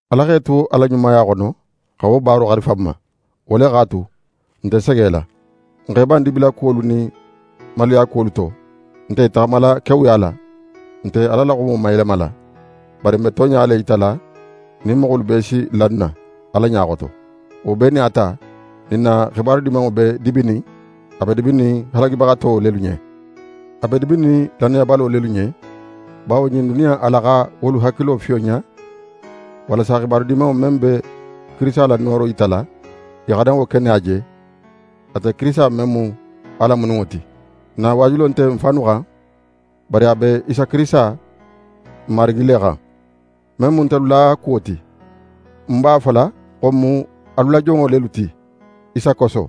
Ala x'é tu a la ɲumaya xono xa wo baaro xarifa n ma, wo le x'a tu, n nte segela. N x'e ban dibilakuwolu nin maluyakuwolu to, n nte i taxamala kewuya la. N nte Ala la xumo mayelemala, bari n be tonɲa le yitala nin moxolu bee si la n na, Ala ɲa xoto. Wo bee nin a ta, nin n na xibaru Dimanŋo be dibinin, a be dibinin halagibaxato lelu ɲen. A be dibinin lannayabalo lelu ɲen, bawo ɲin duniya in ala xa wolu hakilo fiyonɲa, walasa Xibaru Dimanŋo men be Kirisita la nooro yitala, i xana wo keneya je, ate Kirisita men mu Ala mununŋo ti. N na waajulo nte n fannu xan, bari a be Isa Kirisita, n Marigi le xan. Men mu ntelu la kuwo ti, n b'a fola xo n mu alu la jonŋo lelu ti Isa koso.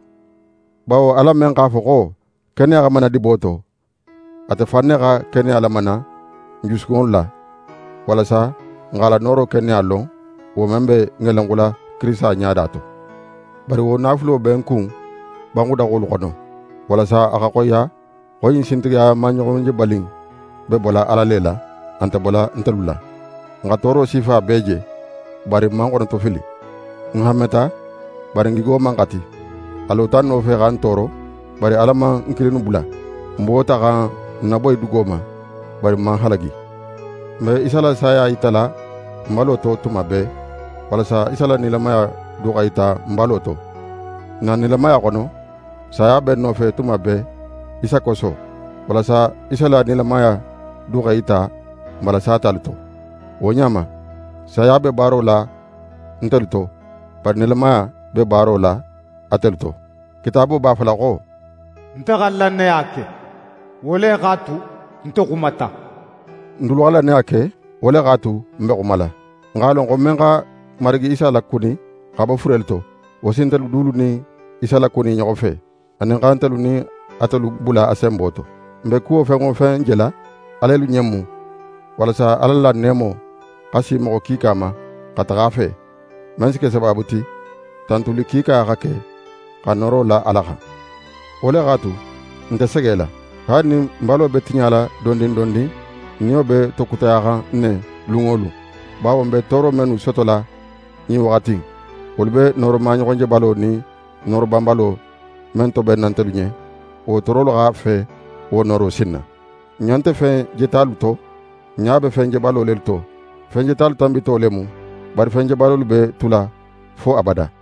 Bawo Ala men x'a fo xo: “Keneya xa mana dibo to,” ate fan ne xa keneya lamana n jusukunŋolu la, walasa n x'a la nooro keneya lon, wo men be ŋelenxula Kirisita ɲada to. Bari wo naafulo be n kun banxudaxolu xono, walasa a xa xoyiya xo ɲin sintigiya maɲoxonjebali in be bola Ala le la, a nte bola ntelu la. N xa tooro sifa bee je, bari n man xonotofili. N hanmeta, bari n gigo man xati. A lota n nofe xa n tooro, bari Ala man n kilinnu bula. N buwota xa n naboyi dugo ma, bari n man halagi. N be Isa la saya yitala n balo to tuma bee, walasa Isa la nilamaya du xa yita n balo to. N na nilamaya xono, saya be n nofe tuma bee Isa koso, walasa Isa la nilamaya du x'é yita n bala satalu to. Wo ɲa ma, saya be baaro la ntelu to, bari nilamaya be baaro la atelu to. Kitaabo b'a fola xo: «Nte xa lannaya ke, wo le x'a tu, nte xumata.» N dulu xa lannaya ke, wo le x'a tu, n be xumala. N x'a lon xo men xa Marigi Isa lakuni xa bo furelu to, wo si ntelu dulu nin Isa lakuni i ɲoxo fe, anin xa ntelu nin atelu bula a senbo to. N be kuwo fen wo fen jela, alelu ɲen mu, walasa Ala la neemo xa si moxo kiika ma xa taxa a fe, men si ke sabaabu ti tantuli kiika xa ke, xa nooro la Ala xan. Wo le x'a tu, n nte segela. Haali nin n balo be tiɲala dondin dondin, n niyo be tokutayaxan ne lun wo lun. Bawo n be tooro mennu sotola ɲin waxati in, wolu be nooro maɲoxonjebalo nin nooro banbalo men tobenna ntelu ɲen, wo toorolu xa fe wo nooro sinna. N ɲa nte fen jetalu to, n ɲa be fen jebalo lelu to. Fen jetalu tanbito le mu, bari fen jebalolu be tula fo abada.